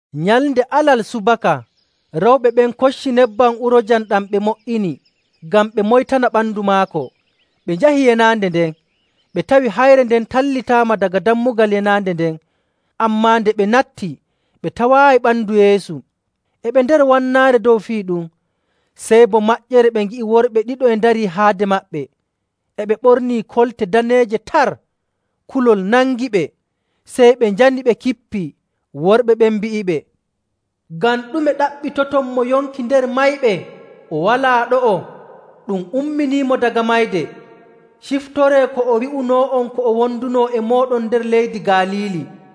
Nyalnde Alal subaka, rewɓe ɓen kocci nebbam uroojam ɗam ɓe mo''ini ngam ɓe moytana ɓandu maako, ɓe njahi yenaande nden. Ɓe tawi hayre nden tallitaama daga dammugal yenaande nden. Ammaa nde ɓe natti, ɓe tawaayi ɓandu Yeesu. E ɓe nder wannaare: Koo boo ɓillaare. dow fii ɗum, sey bo maƴƴere ɓe ngi'i worɓe ɗiɗo e ndarii haade maɓɓe. E ɓe ɓornii kolte daneeje tar. Kulol nangiɓe, sey ɓe njani ɓe kippii. Worɓe ɓen mbi'iɓe, “Ngam ɗume ɗaɓɓitoton mo yonki nder mayɓe? O walaa ɗo'o. Ɗum umminiimo daga mayde! Ciftoree ko o wi'unoo'on ko o wondunoo e mooɗon nder leydi Galiili.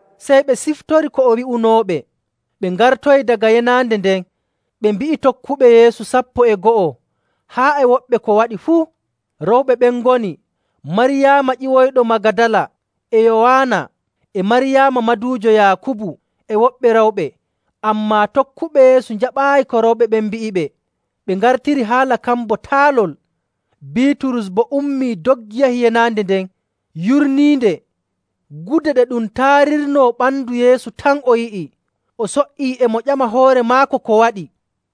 Sey ɓe ciftori ko o wi'unooɓe. Ɓe ngartoyi daga yenaande nden, ɓe mbi'i tokkuɓe Yeesu sappo e go'o, haa e woɓɓe, ko waɗi fuu. Rewɓe ɓen ngoni Maryaama ƴiwoyɗo Magadala, e Yowaana, e Maryaama maduujo Yaakubu, e woɓɓe rewɓe. Ammaa tokkuɓe Yeesu njaɓaayi ko rewɓe ɓen mbi'iɓe, ɓe ngartiri haala kan bo taalol. Biiturus boo ummii, doggi yahi yenaande nden, yurniinde, gude ɗe ɗum taarirnoo ɓandu Yeesu tan o yi'i. O so''ii e mo ƴama hoore maako ko waɗi.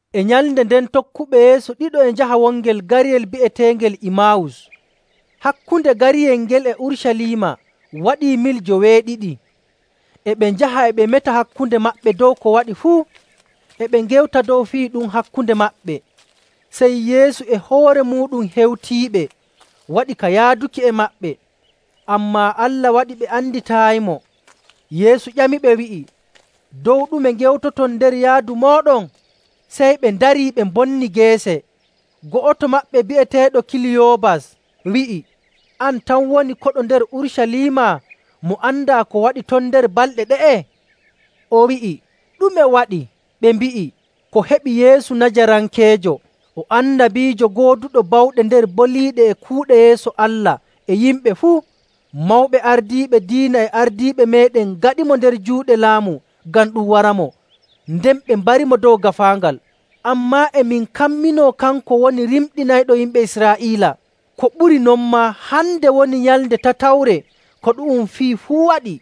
E nyalnde nden tokkuɓe Yeesu ɗiɗo e njaha wongel gariyel bi'eteengel Imaawus. Hakkunde gariyel ngel e Urucaliima waɗii mil joweeɗiɗi. E ɓe njaha e ɓe meta hakkunde maɓɓe dow ko waɗi fuu. E ɓe ngewta dow fii ɗum hakkunde maɓɓe, sey Yeesu e hoore muuɗum hewtiiɓe waɗi ka yaaduki e maɓɓe. Ammaa Allah waɗi ɓe anditaayimo. Yeesu ƴamiɓe wi'i, “Dow ɗume ngewtoton nder yaadu mooɗon?” Sey ɓe ndarii, ɓe mbonni geece. Go'oto maɓɓe bi'eteeɗo Kiliyoobas wi'i, “An tan woni koɗo nder Urucaliima mo andaa ko waɗi ton nder balɗe ɗe'e?” O wi'i, “Ɗume waɗi?” Ɓe mbi'i, “Ko heɓi Yeesu Najarankeejo. O annabiijo gooduɗo bawɗe nder boliiɗe e kuuɗe yeeso Allah e yimɓe fuu. Mawɓe ardiiɓe diina e ardiiɓe meeɗen ngaɗimo nder juuɗe laamu ngam ɗum waramo, nden ɓe mbarimo dow gaafaangal. Ammaa e min kamminoo kanko woni rimɗinayɗo yimɓe Israa'iila. Ko ɓuri non maa, hande woni nyalnde tatawre ko ɗu'um fii fuu waɗi.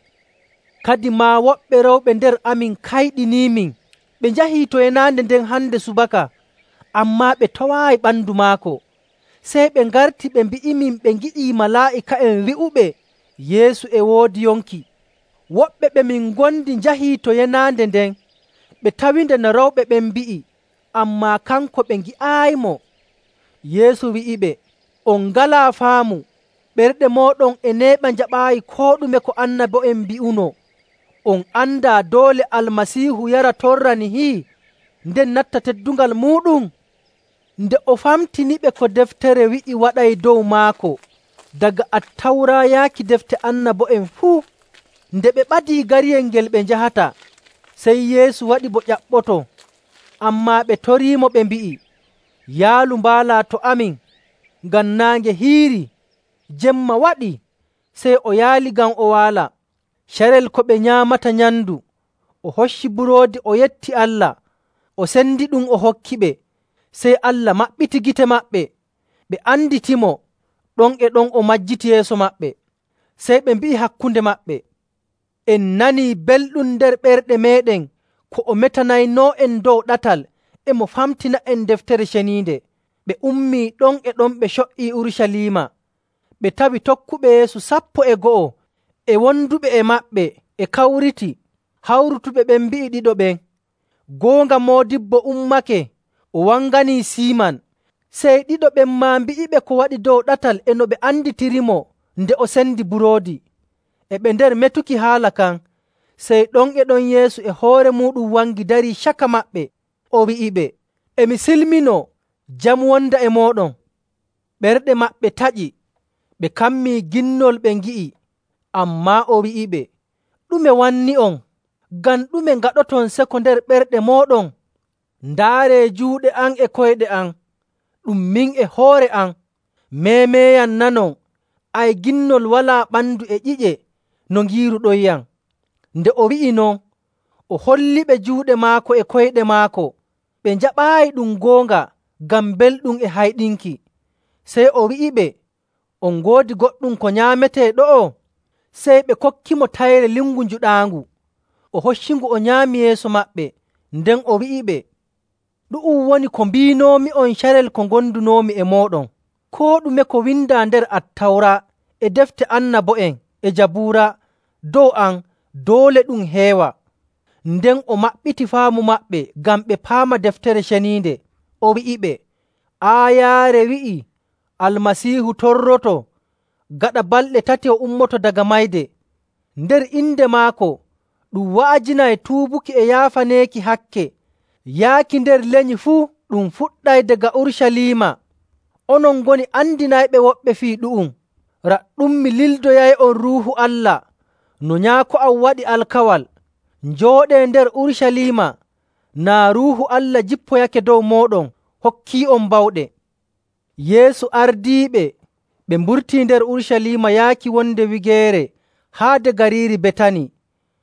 Kadimaa woɓɓe rewɓe nder amin kayɗiniimin. Ɓe njahi to yenaande nden hande subaka, ammaa ɓe tawaayi ɓandu maako. Sey ɓe ngarti ɓe mbi'imin ɓe ngi'ii malaa'ika'en wi'uɓe Yeesu e woodi yonki. Woɓɓe ɓe min ngondi njahi to yenaande nden, ɓe tawinde no rewɓe ɓen mbi'i, ammaa kanko ɓe ngi'aayimo.” Yeesu wi'iɓe, “On ngalaa faamu, ɓerɗe mooɗon e neeɓa njaɓaayi koo ɗume ko annabo'en mbi'unoo! On andaa doole Almasiihu yara torra nihi nden natta teddungal muuɗum?” Nden o famtiniɓe ko Deftere wi'i waɗay dow maako, daga Attawra yaaki Defte Annabo'en fuu. Nde ɓe ɓadii gariyel ngel ɓe njahata, sey Yeesu waɗi bo ƴaɓɓoto. Ammaa ɓe toriimo ɓe mbi'i, “Yaalu mbaalaa to amin, ngam naange hiirii, jemma waɗii.” Sey o yaali ngam o waala. Carel ko ɓe nyaamata nyamndu, o hocci buroodi, o yetti Allah, o sendiɗum, o hokkiɓe. Sey Allah maɓɓiti gite maɓɓe, ɓe anditimo. Ɗon e ɗon o majjiti yeeso maɓɓe. Sey ɓe mbi'i hakkunde maɓɓe, “En nanii belɗum nder ɓerɗe meeɗen ko o metanaynoo'en dow ɗatal e mo famtina'en Deftere Ceniinde.” Ɓe ummii ɗon e ɗon ɓe co''ii Urucaliima. Ɓe tawi tokkuɓe Yeesu sappo e go'o e wonduɓe e maɓɓe e kawriti. Hawrutuɓe ɓen mbi'i ɗiɗo ɓen, “Goonga, Moodibbo ummake. O wanganii Siiman!” Sey ɗiɗo ɓen maa mbi'iɓe ko waɗi dow ɗatal e no ɓe anditirimo nde o sendi buroodi. E ɓe nder metuki haala kan, sey ɗon e ɗon Yeesu e hoore muuɗum wangi darii caka maɓɓe. O wi'iɓe, “E mi silminoo. Jam wonda e mooɗon.” Ɓerɗe maɓɓe taƴi, ɓe kammii ginnol ɓe ngi'i. Ammaa o wi'iɓe, “Ɗume wanni'on? Ngam ɗume ngaɗoton seko nder ɓerɗe mooɗon? Ndaaree juuɗe am e koyɗe am, ɗum min e hoore am. Meemeeyam nanon, ay ginnol walaa ɓandu e ƴi'e no ngiiruɗonyam.” Nde o wi'i non, o holliɓe juuɗe maako e koyɗe maako. Ɓe njaɓaayi ɗum goonga ngam belɗum e hayɗinki. Sey o wi'iɓe, “On ngoodi goɗɗum ko nyaametee ɗo'o?” Sey ɓe kokkimo tayre lingu njuɗaangu, o hoccingu o nyaami yeeso maɓɓe. Nden o wi'iɓe, “Ɗu'um woni ko mbiinoomi'on carel ko ngondunoomi e mooɗon: Koo ɗume ko windaa nder Attawra, e Defte Annabo'en, e Jabuura dow am doole ɗum heewa.” Nden o maɓɓiti faamu maɓɓe ngam ɓe paama Deftere Ceniinde. O wi'iɓe, “Aayaare wi'ii: Almasiihu torroto, gaɗa balɗe tati o ummoto daga mayde. Nder inde maako ɗum wa'ajinay tuubuki e yaafaneeki hakke yaaki nder lenyi fuu. Ɗum fuɗɗay daga Urucaliima. Onon ngoni andinayɓe woɓɓe fii ɗu'um. Raɗɗum, mi lildoyay'on Ruuhu Allah no Nyaako am waɗi alkawal. Njooɗee nder Urucaliima naa Ruuhu Allah jippoyake dow mooɗon hokkii'on bawɗe.”. Yeesu ardiiɓe ɓe mburtii nder Urucaliima yaaki wonde wigeere haade gariiri Betani,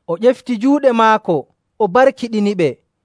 o ƴefti juuɗe maako o barkiɗiniɓe.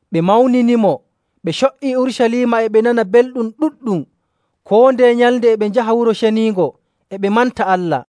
Ɓe mawninimo, ɓe co''ii Urucaliima e ɓe nana belɗum ɗuɗɗum. Koo ndeye nyalnde e ɓe njaha Wuro Ceniingo e ɓe manta Allah.